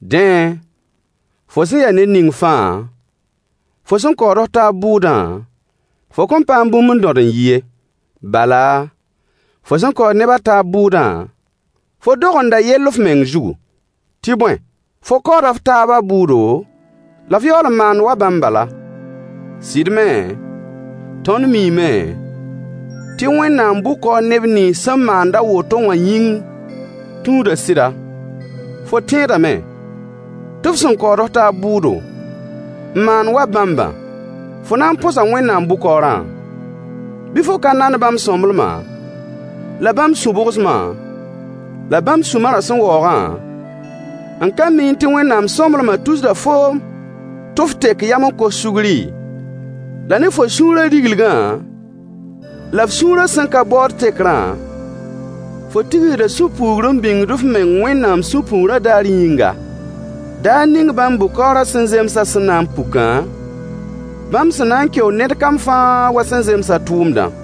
Dẽ, fo sẽn ya ned ning fãa, fo sẽn kaood f taab bʋʋdã, fo kõn paam bũmb n dõd n yi ye. Bala, fo sẽn kaood neb a taab bʋʋdã, fo dogenda yell f meng zugu. Tɩ bõe, fo kaooda f taabã bʋʋdo, la f yaool n maand wa bãmb bala. Sɩd me, tõnd miime tɩ Wẽnnaam bʋ-kaoor neb nins sẽn maand a woto wã yĩng tũuda sɩda. Fo tẽedame tɩ f sẽn kaood f taab bʋʋdo, n maand wa bãmbã fo na n põsa Wẽnnaam bʋ-kaoorã? Bɩ fo ka nand bãmb sõmblemã, la bãmb sũ-bʋgsmã, la bãmb sũ-marã sẽn waoogã, n ka miẽ tɩ Wẽnnaam sõmblemã tusda foom tɩ f tek yam n kos sugri? La ne fo sũurã riglingã la f sũurã sẽn ka baood tekrã, fo tigsda sũ-puugr n bĩngd f meng Wẽnnaam sũ-puugrã daar yĩnga, daar ning bãmb bʋ-kaoorã sẽn zemsã sẽn na n pukã, bãmb sẽn na n keo ned kam fãa wa sẽn zems a tʋʋmdã: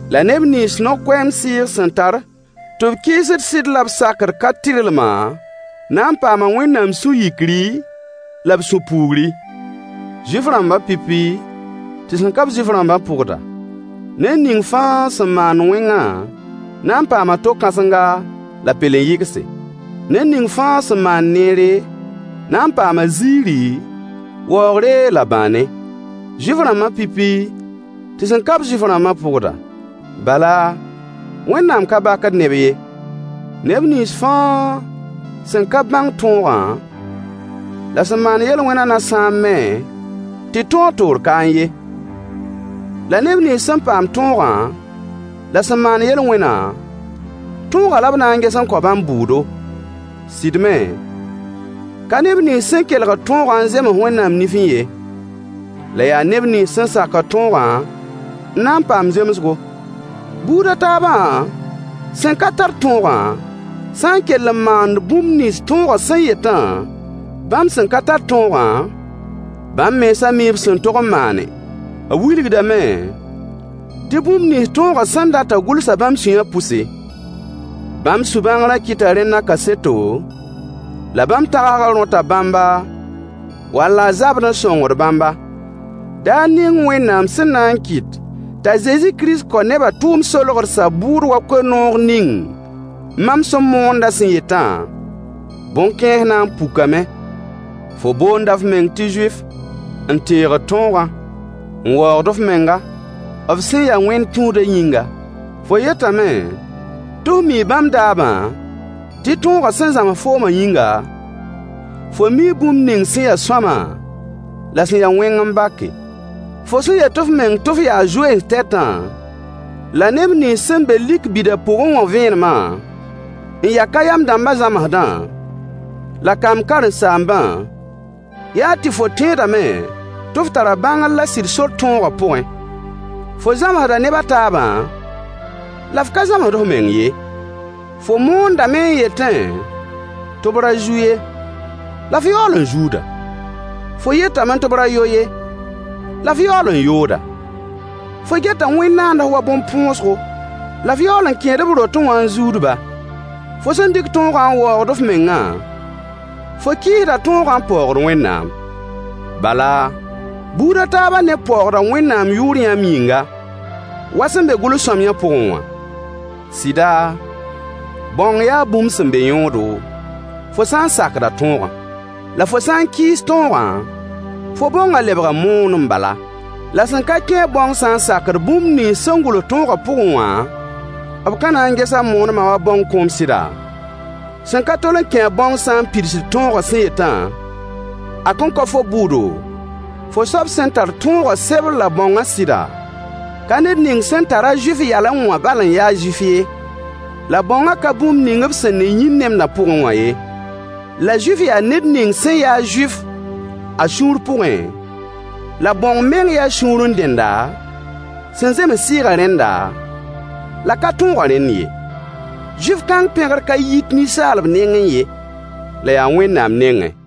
la neb nins no-koɛɛm sɩɩg sẽn tar tɩ b kɩɩsd sɩd la b sakd ka-tɩrlmã na n paama Wẽnnaam sũ-yikri la b sũ-puugri. Zuif-rãmb pipi tɩ sẽn ka-b Zuif-rãmbã pʋgda. Ned ning fãa sẽn maand wẽngã na n paama to-kãsenga la pelen-yɩgse. Ned ning fãa sẽn maand neere, na n paama ziiri, waoogre la bãane. Zuif-rãmbã pipi tɩ sẽn ka-b Zuif-rãmbã pʋgda. Bala, Wẽnnaam ka bakd neb ye. Neb nins fãa sẽn ka bãng tõogã, la sẽn maan yel-wẽnã na sãam me tɩ tõog toor kaẽ ye. La neb nins sẽn paam tõogã la sẽn maan yel-wẽnã, tõogã la b na n ges n kao bãmb bʋʋdo. Sɩd me, ka neb nins sẽn kelgd tõogã n zems Wẽnnaam nifẽ ye. La yaa neb nins sẽn sakd tõogã n na n paam zemsgo. Buud a taabã sẽn ka tar tõogã sã n kell n maand bũmb nins tõogã sẽn yetã, bãmb sẽn ka tar tõogã, bãmb mensã mii b sẽn tog n maane. B wilgdame tɩ bũmb nins tõogã sẽn datã gʋlsa bãmb sũyã pʋse. Bãmb sũ-bãngrã kɩta rẽnda kaseto, la bãmb tagsgã rõta bãmba wall a zabd n sõngd bãmba. Daar ning Wẽnnaam sẽn na n kɩt tɩ Kirist Zezi kao nebã tʋʋm-solgdsã bʋʋd wa koe-noog ning mam sẽn moondã sẽn yetã, bõn-kãens na n pukame. Fo boonda f meng tɩ Zuif, n teegd tõogã, n waoogd f menga, f sẽn ya wẽn-tũudã yĩngã. Fo yetame tɩ f mii bãmb daabã, tɩ tõogã sẽn zãms foomã yĩnga, fo mii bũmb ning sẽn ya sõama la sẽn ya wẽng n bake. Fo sẽn yet f meng tɩ f yaa zoens tɛtã, la neb nins sẽn be lik bida pʋgẽ wã vẽenemã, n ya ka-yam dãmbã zãmsdã, la kamb karen-saambã, yaa tɩ fo tẽedame tɩ f tara bãngr la sɩd sor tõogã pʋgẽ. Fo zãmsda neb a taabã, la f ka zãmsd f meng ye. Fo moondame n yetẽ tɩ b ra zu ye, la f yaool n zuuda! Fo yetame tɩ b ra yo ye, la f yaool n yooda! Fo geta wẽnd-naands wa bõn-põosgo, la f yaool n kẽed b rotẽ wã n zuud-ba! Fo sẽn dɩk tõogã n waoogd f mengã, fo kɩɩsda tõogã n paoogd Wẽnnaam. Bala, buud a taabã neb paoogda Wẽnnaam yʋʋr yãmb yĩnga, wa sẽn be gʋls-sõamyã pʋgẽ wã. Sɩda, bãong yaa bũmb sẽn be yõodo, fo sã n sakda tõogã. La fo sã n kɩɩs tõogã, fo bãongã lebga moonem bala. La sẽn ka kẽ-a bãong sã n sakd bũmb nins sẽn gʋls tõogã pʋgẽ wã, b ka na n ges a moonemã wa bãong kõom sɩda? Sẽn ka tol n kẽ-a bãongã sã n pidsd tõogã sẽn yetã, a kõn kao fo bʋʋdo, fo soab sẽn tar tõogã sebr la bãongã sɩda? Ka ned ning sẽn tar-a Zuif yalẽ wã bal n ya Zuif ye. La bãongã ka bũmb ning b sẽn ne yĩn-nemdã pʋgẽ wã ye. La Zuif yaa ned ning sẽn ya-a Zuif a sũur pʋgẽ, la bãong meng yaa sũurẽ dẽnda, sẽn zems Sɩɩgã rẽnda, la ka tõogã rẽnd ye. Zuif kãng pẽgr ka yit ninsaalb nengẽ ye, la yaa Wẽnnaam nengẽ.